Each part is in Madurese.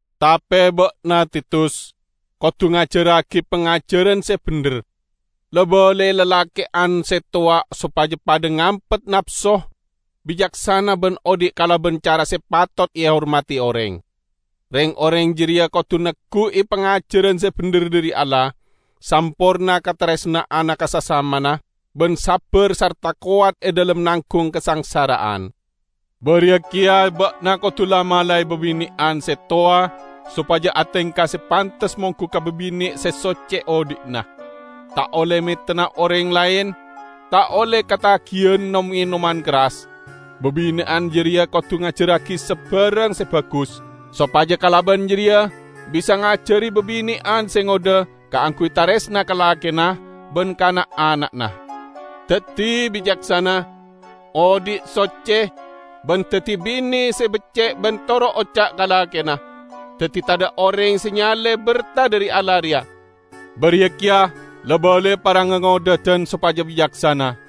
Tape ba'na, Titus, kodu ngajarragi pangajaran se bendher. La-balai lalake'an se towa sopaja padha ngampet napso, bicaksana ban odhi' kalaban cara se patot ehormadi oreng. Reng-oreng jareya kodu neggu'i pangajaran se bendher dhari Allah, samporna kataresna'anna ka sasamana ban sabbar sarta kowat e dhalem nanggung kasangsara'an. Bariya keya ba'na kodu la-malae babine'an se towa sopaja atengka se pantes monggu ka babine' se socce odhi'na. Ta' olle metenna oreng laen, ta' olle katagiyan nom-enoman kerras. Babine'an jareya kodu ngajarragi sabarang se bagus, sopaja kalaban jareya bisa ngajari babine'an se ngodha kaangguy taresna ka lakena ban ka na'-ana'na, daddi bicaksana, odhi' socce, ban daddi bine se becce' ban toro' oca' ka lakena; daddi tadha' oreng se nyale berta dhari Allah reya. Bariya keya, la-balai para ngangodhadan sopaja bicaksana.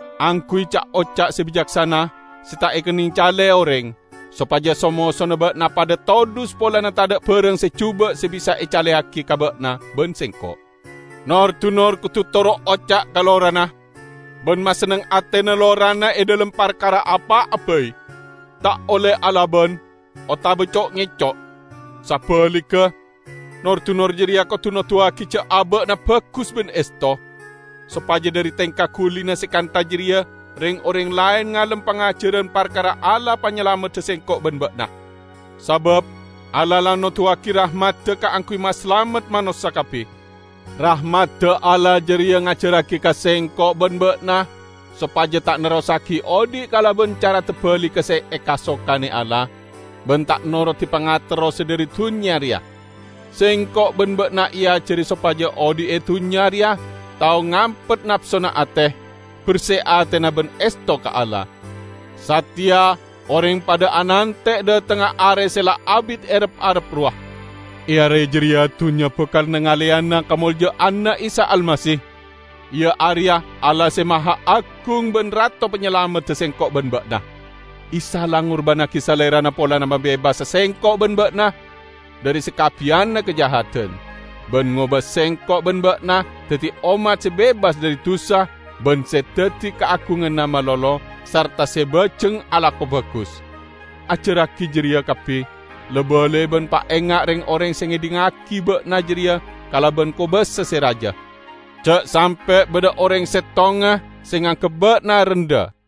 Angguy ca'-oca' se bicaksana, se ta' ekenneng cale oreng, sopaja so-mosona ba'na padha todhus polana tadha' barang se juba' se bisa ecaleyagi ka ba'na ban sengko'. Nor-dunor kodu toro' oca' ka lorana, ban masenneng atena lorana e dhalem parkara apa'a bai. Ta' olle alaban, otaba co'-ngeco'. Sabaligga, nor-dunor jareya kodu noduwagi ja' aba'na bagus ban esto, sopaja dhari tengka gulina se kantha jareya reng-oreng laen ngalem pangajaran parkara Allah Panyalamedda sengko' ban ba'na. Sabab Allah la noduwagi rahmadda kaangguy masalamet manossa kabbi. Rahmadda Allah jareya ngajarragi ka sengko' ban ba'na sopaja ta' nerrossagi odhi' kalaban cara tabaligga se ekasokane Allah, ban ta' norodi pangaterro se dhari dunnya reya. Sengko' ban ba'na eajari sopaja odhi' e dunnya reya tao ngampet napsona ate, berse atena ban esto ka Allah. Sateya oreng padha anante' dhatengnga Are se la abit erep-arep rowa; e Are jareya dunnya bakal nangaleyana kamolja'anna Isa Almasih, iya areya Allah Se Mahaagung ban Rato Panyalamedda sengko' ban ba'na. Isa la ngurbannagi Salerana polana mabebasa sengko' ban ba'na dhari sakabbiyanna kajahadan, ban ngoba sengko' ban ba'na daddi ommat se bebas dhari dusa ban se daddi kaagunganna malolo, sarta se bajeng alako bagus. Ajarragi jareya kabbi, la-balai ban paenga' reng-oreng se ngedhingngagi ba'na jareya kalaban kobasa se raja. Ja' sampe' badha oreng settonga se nganggep ba'na rendha.